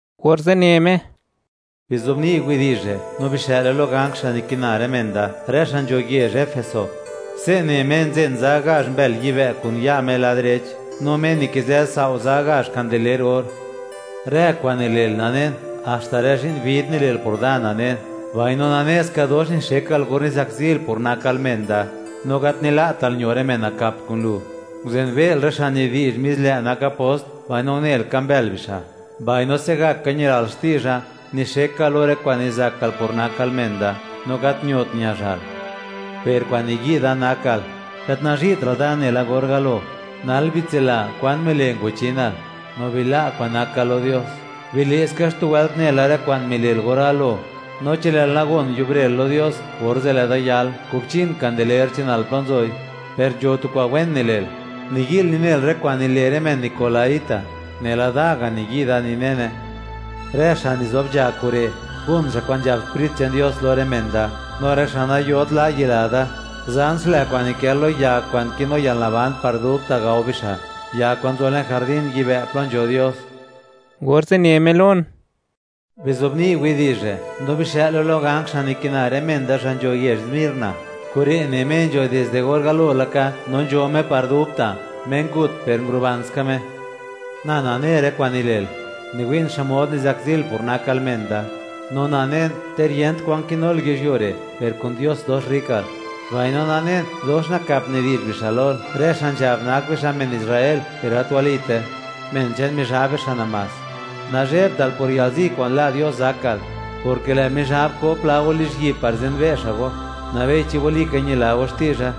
Orze' ne Me: ―Bizobni' widi'zh re' no bixë'le lo ganj, xa' nikina rë men da, rë xa' nzho yezh Efeso: “Se' ne Me nzen za gazh mbël yibë' kun ya' Me lad direch, no Me nikizë sao' za gazh kandeler or: Rë kwa'n nile'l nanen, haxta rë zhi'n vid nile'l por Da nanen; mbaino nane ska dox nixekal or nizakzil por nakal men da, no gat nila'tal ño rë men nakap kun lu. Nguzenbe'l rë xa' (miwi'l xmod nak rë xa') nidi'zh mis lë' nak apost, mbaino unel, ka mbël bixa'. Mbaino se'gaka ñilal xti'zha, nixekal lo rë kwa'n nizakal por nakal men da, no gat ñot ñazhal. Per kwa'n niyi' Da nakal, gat nazhi'tra'l Da nela or galo. Nal bitsila kwan mile' ngwachinal, no bila' kwa'n nakal lo Dios; bile' ska xtu wëlt nela rë kwa'n mile'l or galo; no chi lë'l nagon yubre'l lo Dios, orze' lë' Da yal, kubchin kandeler che'nal plo nzoi. Per nzho tu kwa'n wen nile'l: Niyi'l ninel rë kwa'n nile' rë men nikolaíta, nela da ga' niyi' da ninene. Rë xa' nizob nzha kure', gon xa' kwa'n nzhab Sprit che'n Dios lo rë men da, no rë xa' nayot la' yila Da, zan xlë kwa'n nikë lo ya kwa'n kinu yalnaban par dubta', gao bixa', ya kwa'n nzo le'n jardín yibë' plo nzho Dios.” Orze' ne Me lon: ―Bizobni' widi'zh re' no bixë'le lo ganj xa' nikina rë men da xa' nzho yezh Smirna: “Kure' ne Me nzho dizde or galo laka no nzho Me par dubta'; Me ngut per nguruban ska Me: Na nane rë kwa'n nile'l; niwi'n xmod nizakzil por nakal men da, no nanen, ter yent kwan kinul yizhyuo re', per kun Dios dox rrikal; mbaino nanen dox nakap nidi'zh bixa' lol, rë xa' nzhab nak bixa' men Israel, per gat walite; men che'n Mizhab bixa' namás. Nazhebtal por yalzi kwa'n la' Dios zakal, porke lë' Mizhab ko pla go lizhyi'b par zenbe' xa' go, nabei chi walika ñila go xti'zha;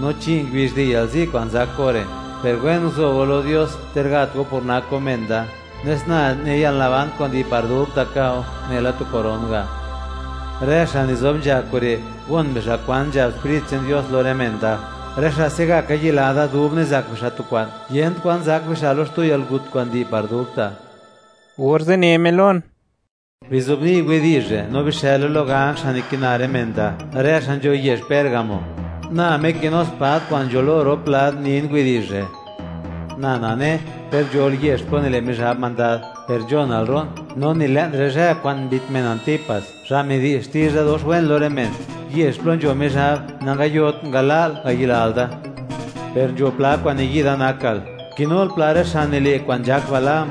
no chi' ngubizh di' yalzi kwa'n zak go re', per wen guzo go lo Dios, ter gat go por nak go men da, nes na ne yalnaban kwa'n di' par dubta' ka'o, nela tu koron ga'. Rë xa' nizob nzha kure', gon bixa' kwa'n nzhab Sprit che'n Dios lo rë men da: rë xa' se'gaka yila Da dub nizak bixa' tu kwa'n, yent kwan zak bixa' lo xtu yalgut kwa'n di' par dubta'.” Orze' ne Me lon: ―Bizobni' widi'zh re' no bixë'le lo ganj xa' nikina rë men da, rë xa' nzho yezh Pérgamo: “Na Me kinu spad kwa'n nzho lo rop lad, nin widi'zh re': Na nane, ter nzhol yezh plo nile' Mizhab mandad, per nzhonra'l ro'n, no ni le'n rë zhë kwa'n mbit men Antipas, xa' midi'zh xti'zha dox wen lo rë men, yezh plo nzho Mizhab, nangayot ngala'l ngayilal Da. Per nzho pla kwa'n niyi' Da nakal: Kinul pla rë xa' nile' kwa'n nzhak Balaam,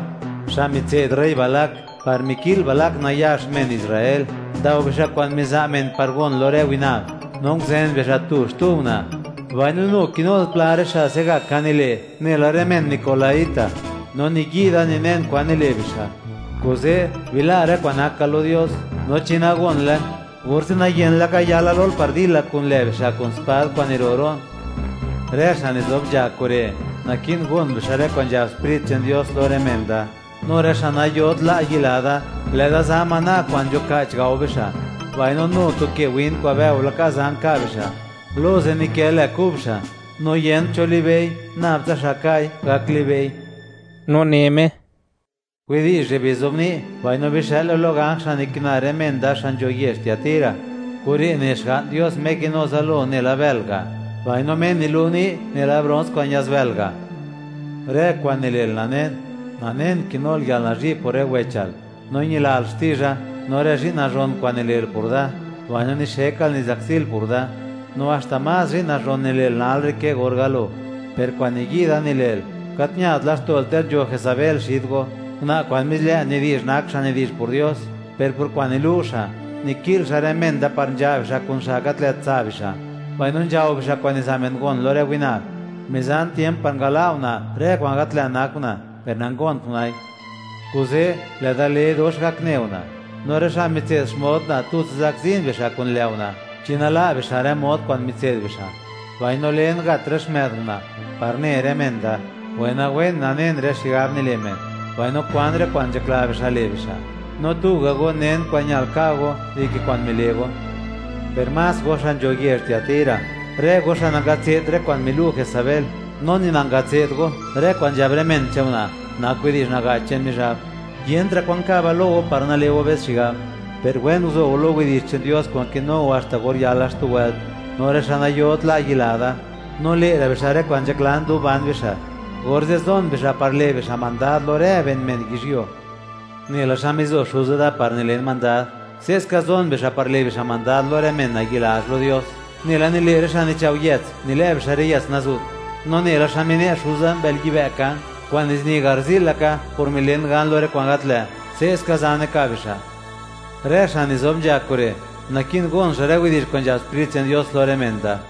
xa' mitse'd rey Balac par miki'l Balac nayax men Israel, ndao bixa' kwa'n miza' men par gon lo rë winab, no nguzen bixa' tu-xtu una'. Mbaino nu kinul pla rë xa' se'gaka nile' nela rë men nikolaíta, no niyi' da ninen kwa'n nile' bixa'. Kuze', bila' rë kwa'n nakal lo Dios, no chi nagonle, orze' nayen laka yala lol par dila kun lë' bixa' kun spad kwa'n niro' ro'n. Rë xa' nizob nzha kure', naki'n gon bixa' rë kwa'n nzhab Sprit che'n Dios lo rë men da, no rë xa' nayot la' yila Da, lë' Da za maná kwa'n nzhuka'ch gao bixa', mbaino nu tu ke win kwa'n bëo laka, zan ka' bixa', lo ze' nikë lë kub xa', no yent cho libe'i, nab tsa xa' ka'i gak libe'i.” No ne Me: ―Widi'zh re' bizobni' mbaino bixë'le lo ganj xa' nikina rë men da xa' nzho yezh Tiatira: “Kure' ne Xga'n Dios Me kinu zalo nela bël ga', mbaino Me nilu' ni' nela brons kwa'n ña'zbël ga': Rë kwa'n nile'l nanen; nanen kinul yalnazhi' por rë wechal, no ñilal xti'zha, no rë zhi'n nazhon kwa'n nile'l por da, mbaino nixekal nizakzil por Da; no haxta más zhi'n nazhon nile'l nal re' ke or galo. Per kwa'n niyi' Da nile'l, gat ñat laxto'l ter nzho Jesabel xid go, una' kwa'n mis lë' nidi'zh nak xa' nidi'zh por Dios, per por kwa'n nilu' xa', niki'l xa' rë men da par nzha' bixa' kun xa' gat lë't tsa' bixa', mbaino nzhao bixa' kwa'n niza' men gon lo rë winab. Mizan tiemp par ngala' una' rë kwa'n gat lë't nak una', per nangont una'i. Kuze', lë' Da le dox gakne una', no rë xa' mitse'd xmod una' tutsa zakzin bixa' kun lë' una' chi nala' bixa' rë mod kwa'n mitse'd bixa'. Mbaino len, gat rë xmë'd una', par ne rë men da, wenawen nanen rë xigab nile' men, mbaino kwan rë kwa'n nzhakla bixa' le' bixa', no tuga' go nen kwa'n ñal ka' go dike kwa'n mile' go. Per más go xa' nzho yezh Tiatira, rë go xa' nangatse'd rë kwa'n milu' Jesabel, no ni nangatse'd go rë kwa'n nzhab rë men che'n una' nak widi'zh naga'ch che'n Mizhab, yentra' kwa'n ka'ba lo go par nale' go be's xigab, per wen guzo go lo widi'zh che'n Dios kwa'n kinu go haxta or yala xtu wëlt, no rë xa' nayot la' yila Da, no le'ra' bixa' rë kwa'n nzhaklan dub ban bixa', orze' zon bixa' par le' bixa' mandad lo rë ben men yizhyuo. Nela xa mizo Xuza Da par nilen mandad, se'ska zon bixa' par le' bixa' mandad lo rë men nayi'lazh lo Dios, nela nile' rë xa' nichao' yëts, nilë' bixa' rë yëts nazu't. No nela xa mine' Xuza mbël yibë' kan, kwa'n nizini garzi'l laka por milen gan lo rë kwa'n gat lë', se'ska zane ka' bixa'. Rë xa' nizob nzha kure', naki'n gon xa' rë widi'zh kwa'n nzhab Sprit che'n Dios lo rë men da.”